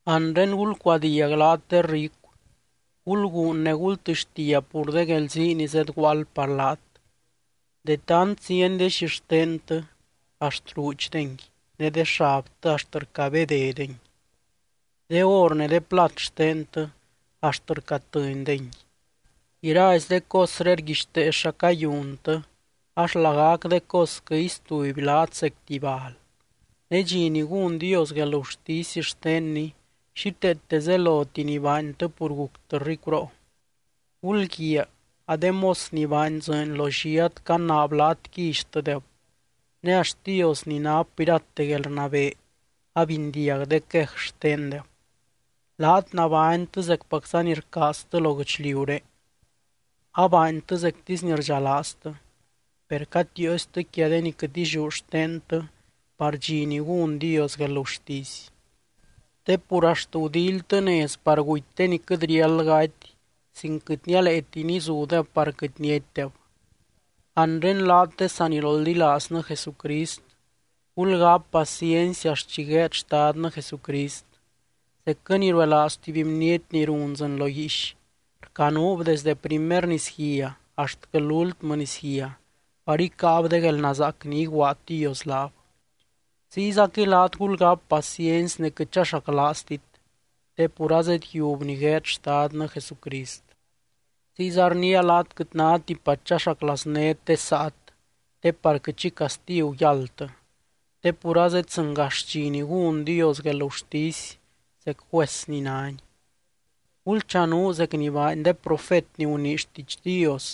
Anre, ¡gulcuadiag laat de ricu! Gulguun ne gultɨxtia pur de guelzii ni zedguaald par laat. De tant zieny de xixtentɨ axt ruudxdengui ne de xabtɨ axt rcabédedengui. De or ne de plat xtentɨ axt rcatɨndengui. Iraizy de cosré rguixtee xa cayuntɨ ax lagac de cosquɨ istuby laat zec tuby bal. Ne dxi ni gún Dios guelgurtisy xtenny, xíteete zeloti ni baantɨ pur guctɨ ricuroo. Gulguiaa, a de mos ni baany dzɨɨny lo lliat canaab laat quillytɨdeb, ne axt Dios ni nap irate guelrnabee abindiag de quej xtendeb. Laat nabánytɨ zecpacza ni rcaaztɨ lo guɨchliuré, abaantɨ zectisy ni rdxalaaztɨ. Per catiiostɨ quia de ni quɨt illiú xtentɨ par dxi ni gún Dios guelgurtisy. Te pur axt gudíilytɨ nez par guty de ni quɨt riáld gaty sin quɨt nialeeti nizudeb par quɨt niatydeb. Anre laat de saniroldilaaznɨ Jesucrist, gulgáp paciency axt chi gueed Xtadnɨ Jesucrist. Zecquɨ ni ruelaaz tuby bniety ni run dzɨɨny lo guiix, rcanuub desde primer nisguia axtquɨ lúltmɨ nisguia par icáab de guelnazaac ni iguaad Dios laab. Ziyzaquɨy laat gulgáp paciency ne quɨt chaxaclaaztit, te pur azedyiub ni gueed Xtadnɨ Jesucrist. Ziyza rniia laat quɨt náti par chaxaclaaznét de saat, te par quɨt xi castigu yáldtɨ. Te pur azeddzɨngax dxi ni gún Dios guelgurtisy zec juez ni nány. Gulchanuu zec ni baany de profet ni gunii xtiidx Dios,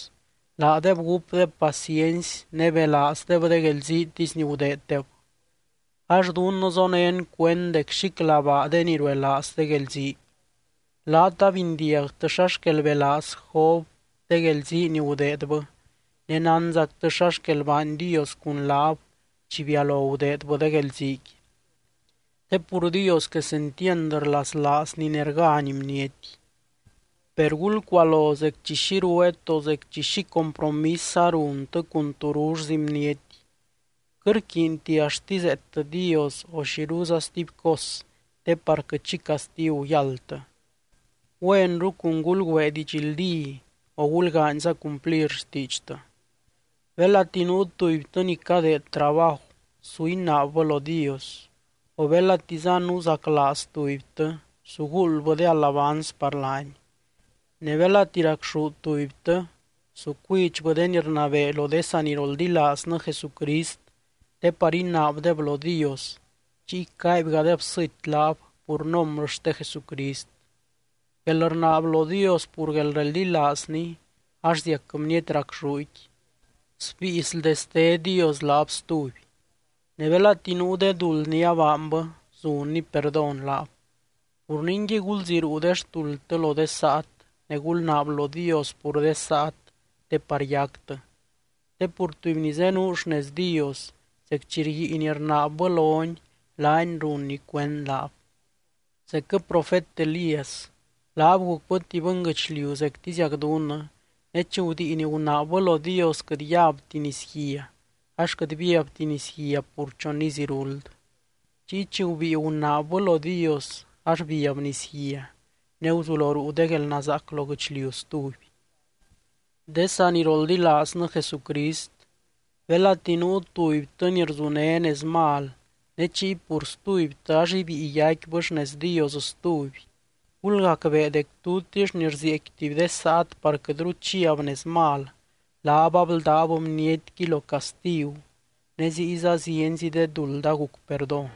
laadeb gúpdeb paciency ne belaazdeb de guelziitisy ni gudeeddeb. Ax dunnɨ zonén cuend dec xíclabaa de ni ruelaaz de guelzii. Laat abindiagtɨ xa xquel belaaz Job de guelzii ni gudeedbɨ, ne nánzactɨ xa xquel baany Dios cun laab chi bialo gudeedbɨ de guelziiqui. Te pur Dios quesentiand rlaslaazny ne rgány bniety. Per gulcualo zec chi xi rueet o zec chi xi compromisza runtɨ cun turullzi bniety, quɨt rquiinti axt izeettɨ Dios o xiruza stuby cos te par quɨt xi castigu yáldtɨ. Güenru cun gulgüee didxldí o gulgaanyza cumplir xtiidxtɨ. Belati nuu tubytɨ ni cadeed trabaju, su inaabbɨ lo Dios. O belatiza nuzaclaaz tubytɨ, su guuldbɨ de alabanz par laany. Ne belati racxú tubytɨ, su cuidxbɨ de ni rnabee lo de saniroldilaaznɨ Jesucrist te par inaabdeb lo Dios, chiy caaibgadeb sɨty laab pur nombrɨ xte Jesucrist. Guelrnaab lo Dios pur guelreldilaazny ax ziac bniety racxúqui, sbíi sldeste Dios laab stuby. Ne belati nuu de duld ni abaanbɨ, zunny perdón laab. Pur ningui, gulziruu de xtuldtɨ lo de saat, ne gulnaab lo Dios pur de saat te par yactɨ. Te pur tuby ni zenuu xnez Dios, zec chi rguiin rnaabbɨ lony laany runny cuend laab. Zecquɨ profet Elías, laab gucbɨ tuby bɨnguɨchliu zectiziac dunnɨ, ne chi gudiin gunaabbɨ lo Dios quɨt yabti nisguia ax quɨt biabti nisguia pur chon iz iruld. Chiy chi gubíi gunaabbɨ lo Dios, ax biab nisguia ne guzulo ruu de guelnazaac lo guɨchliu stuby. De saniroldilaaznɨ Jesucrist, belati nuu tubytɨ ni rzuné nez mal ne chiy pur stubytɨ ax ibíi yaicquibɨ xnez Dios stuby, gulgacbee dec tutix ni rzieecqui tuby de saat par quɨtru chiab nez mal, laab abldáb bnietqui lo castigu ne ziyza zienzi de duld aguc perdón.